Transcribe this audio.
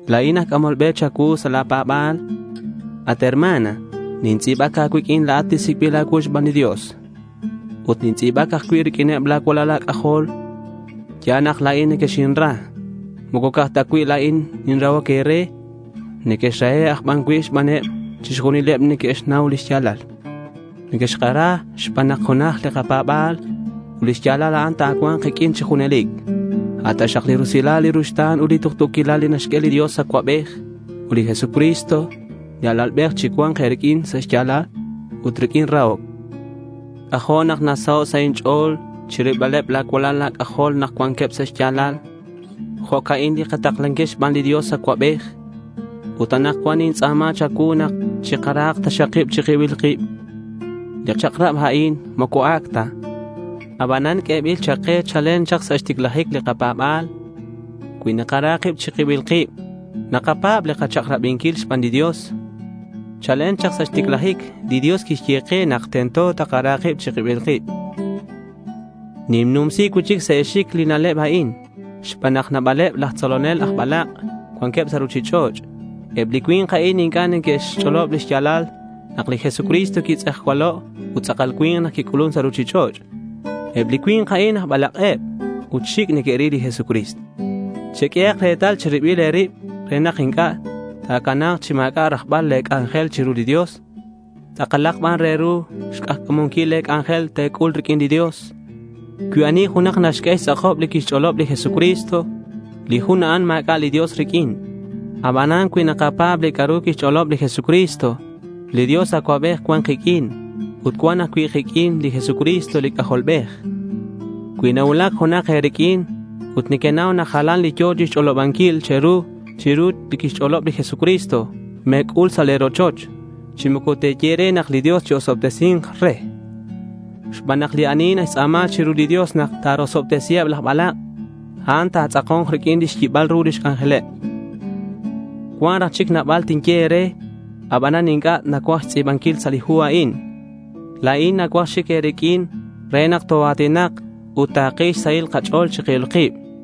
La̱in aj c'amol be cha̱cuu sa' la̱ pa̱ba̱l. At hermana, nintz'i̱bac a̱cuiq'uin la̱at li sic'bil a̱cuu xban li Dios. Ut nintz'i̱bac ajcui' riq'uineb la̱ cualal a̱c'ajol. Ya̱l nak la̱in nequexinra. Moco ca'aj ta cui' la̱in ninrahoc e̱re. Nequexrahe' aj ban cui' xbaneb chixjunileb li neque'xnau li xya̱lal. Nequexkara xban nak junaj li nakapa̱b ut lix ya̱lal a'an ta̱cua̱nk kiq'uin chi junelic. A' taxak li rusilal, li ruxta̱n ut li tuktu̱quilal li naxq'ue li Dios Acuabej ut li Jesucristo li Alalbej chicua̱nk e̱riq'uin sa' xya̱lal ut riq'uin rahoc. C'ajo' nak nasaho' sa' inch'o̱l chirilbaleb la̱ cualal a̱c'ajol nak cuanqueb sa' xya̱lal. Jo'ca'in li kataklanquil xban li Dios Acuabej. Ut anakcuan nintz'a̱ma cha̱cuu nak chikarahak taxak kib chi kibil kib. Li chak'rab a'in moco ac' ta. Abanan q'uebil chak ke chalen chak sa' xticlajic li kapa̱ba̱l. Cui nakara kib chi kibil kib, nakapa̱b li kachak'rabinquil xban li Dios. Chalen chak sa' xticlajic, li Dios quixye ke nak tento takara kib chi kibil kib. Ninnumsi cui'chic sa' e̱xic li na'leb a'in xban nak nabaleb laj tzolonel aj balak' cuanqueb sa' ruchich'och'. Eb li cui̱nk a'in inc'a' neque'xch'olob li xya̱lal nak li Jesucristo quitz'ejcualo' ut tz'akal cui̱nk nak quic'ulun sa' ruchich'och'. Eb li cui̱nk a'in aj balak'eb ut xic' neque'ril li Jesucristo. Cheq'uehak retal che̱ribil e̱rib re nak inc'a' ta̱cana̱k chi ma̱c'a' rajbal le̱ c'anjel chiru li Dios. Tz'akalak ban re ru xk'ajca̱munquil le̱ c'anjel te̱c'ul riq'uin li Dios. Cui ani junak naxq'ue xtz'akob li quix-ch'olob li Jesucristo, li jun a'an ma̱c'a' li Dios riq'uin. Abanan cui nakapa̱b li c'a'ru quixch'olob li Jesucristo, li Dios Acuabej cua̱nk kiq'uin ut cua̱nk ajcui' kiq'uin li Jesucristo li C'ajolbej. Cui nacuulac junak e̱riq'uin ut nequenau nak jalan li yo̱ chixch'olobanquil che̱ru chiru li quixch'olob li Jesucristo, me̱c'ul sa' le̱ rochoch chi moco te̱ye re nak li Dios chi-osobtesi̱nk re. Xban nak li ani naxtz'a̱ma chiru li Dios nak ta̱rosobtesiheb laj balak', a'an ta̱tz'ako̱nk riq'uin lix yibal ru lix c'anjeleb. Cuan raj chic nabal tinye e̱re, abanan inc'a' nacuaj xtz'i̱banquil sa' li hu a'in. La̱in nacuaj xic e̱riq'uin re nak toa̱tinak ut takil xsahil kach'o̱l chi kibil kib.